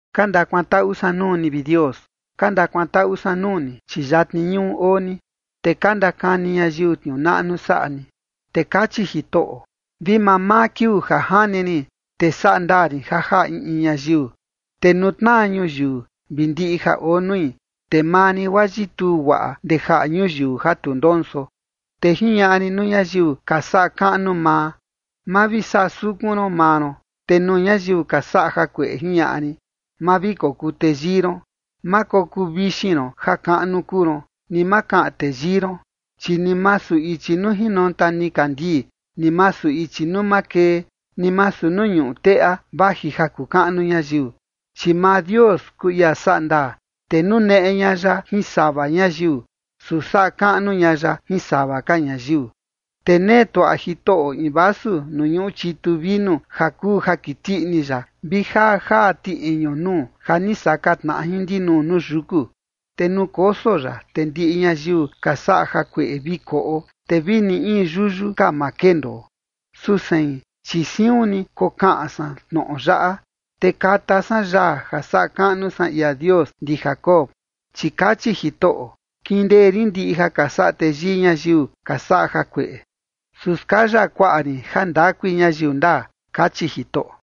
Ka ndakuantaꞌu san nuu ni, vi Dios, ka ndakuantaꞌu san nuu ni, chi yatni ñuꞌu oo ni, te ka ndakani ñayiu tniuu naꞌnu saꞌa ni. Te kachi Jitoꞌo: “Vi mamaa kiuu ja jani rin, te saꞌa ndaa rin ja jaꞌa in in ñayiu. Te nuu tnaa ñuyiu vi ndiꞌi ja oo nui, te maa rin guaa yituu guaꞌa ndee jaꞌa ñuyiu ja tu ndonso. Te jiñaꞌa rin nuu ñayiu ka saꞌa kaꞌnu maa: Ma vi saꞌa sukun ron maa ron. Te nuu ñayiu ka saꞌa jakueꞌe, jiñaꞌa rin: Ma vi kokuu teyii ron. Ma kokuu vixin ron ja kaꞌnu kuu ron, ni ma kaꞌan teyii ron.” Chi ni masu ichi nuu jinonta nikandii, ni masu ichi nuu makee, ni masu in ñuꞌu teꞌa, vaji ja kuu kaꞌnu ñayiu. Chi maa Dios kuu ia saꞌa ndaa, te nuneꞌe ña ya jin sava ñayiu, su saꞌa kaꞌnu ña ya jin sava ka ñayiu. Te nee tuaꞌa Jitoꞌo in vasu nuu ñuꞌu chitu vinu ja kuu ja kiti ini ya, vi jaa jaa tiꞌiñu nuu ja ni saka tnaꞌa jin ndinuu nuu yuku, te nuu koso ya, te ndiꞌi ñayiu ka saꞌa jakueꞌe vi koꞌo, te vi ni in yuyu ka ma kendoo. Su sein, chi siun ni kokaꞌan san tnoꞌo yaꞌa, te kata san yaa ja saꞌa kaꞌnu san ia Dios ndi Jacob. Chi kachi Jitoꞌo: “Kindee rin ndiꞌi ja ka saꞌa teyii ñayiu ka saꞌa jakueꞌe, su skaya kuaꞌa rin jandakui ñayiu ndaa”, kachi Jitoꞌo.